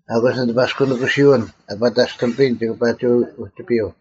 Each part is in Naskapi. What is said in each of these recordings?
ᐊᑯᔅ ᓂ ᑎᐸᔅᑯᓂᑯᓯᐅᓐ ᐊ ᐸᑕᔅᑎᒥᐱᔨᓐ ᒋᑭ ᐸᒋ ᐅᒋᐱᔪᐤ;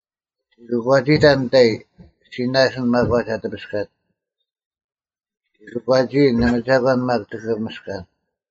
ᔅᒋ ᑯᒂᒋᑕᓐ ᓂᑕᐃ; ᔅᒋ ᓇᓯᓐ ᒪᒂᒡ ᐊ ᑎᐱᔅᑲᒡ; ᔅᒋ ᑯᒂᒋᐃᓐ, ᓇᒪ ᒐᒂᓐ ᒪᒃ ᒋᑭ ᒥᔅᑲᓐ: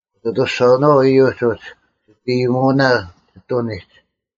ᐅᑦ ᐊᑐᔅᒐᐅᓄᐛᐛ ᐃᔪᒡ ᐅᒋ, ᒋᑦ ᐃᔨᒧᐅᓇ ᒋᑐᓂᒡ,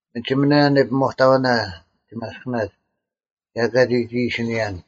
ᒥᒋᒥᓇ ᓂᐱᒧᑕᐅᓇ ᒋᒪᔅᑭᓇᒡ, ᒐ ᐊᑲ ᒋ ᒋᐃᓯᓂᔭᓐ᙮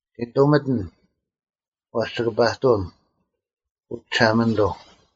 ᔅᒋ ᓇᑐᒥᑎᓐ; ᐛᔅ ᒋᑭ ᐸᑐᐅᓐ, ᐅ ᒋᓴᒪᓂᑐᐤ: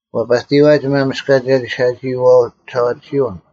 ᐛᐸᑎᔨᐛ ᒋᒪᒥᔅᑲᒋ-ᓴᒋᐃᐛᐎ ᒋᓴᐛᑎᓯᐅᓐ,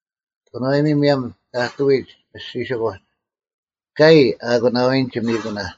ᑭᓄᐛᔨᒥ ᒧᔭᒻ ᑕᑐᐎᒡ ᒥᔅᒋᓯᑯᒡ, ᑲᔨ ᐊ ᐊᑯᓇᐎᓐ ᒋᒥᑯᓇ,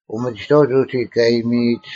ᐅᒥᒋᑥᐅᒡ ᐅᒋ ᑲ ᐊᔨᒥᐃᒡ,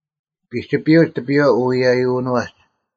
ᐱᒋᐱᔪᐛᒡ ᑎᐱᔽ ᐅᐎᔨᔪᓄᐛᒡ: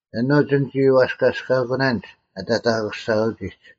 ᐊᓄᒡ ᓂᒋ ᐛᔅᑲᔅᑲᑯᓇᓐᒡ ᐊ ᑕᑕᑯᔅᒐᐅᒋᒡ: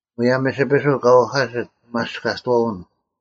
ᒧᔭᒻ ᒥᓯᐱᓱᐤ ᑲ ᐅᐧᑲᓯᑦ ᐅᒪᔅᑲᑥᐅᓐ,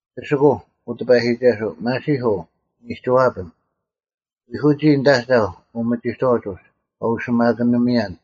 ᐱᓯᑯᐤ, ᐅ ᑎᐸᔨᒋᒐᓱᐤ, ᒪᓯᐧᑯᐤ, ᓂᒋᐛᐱᓐ: ᐎᐧᑯᒋ ᓂᑦ ᐊᒐᐧᒄ ᐅᒪᒋᑥᐅᒡ ᐅᒡ, ᑲ ᐅᓯᒪᑭᓂᒥᔭᓐ: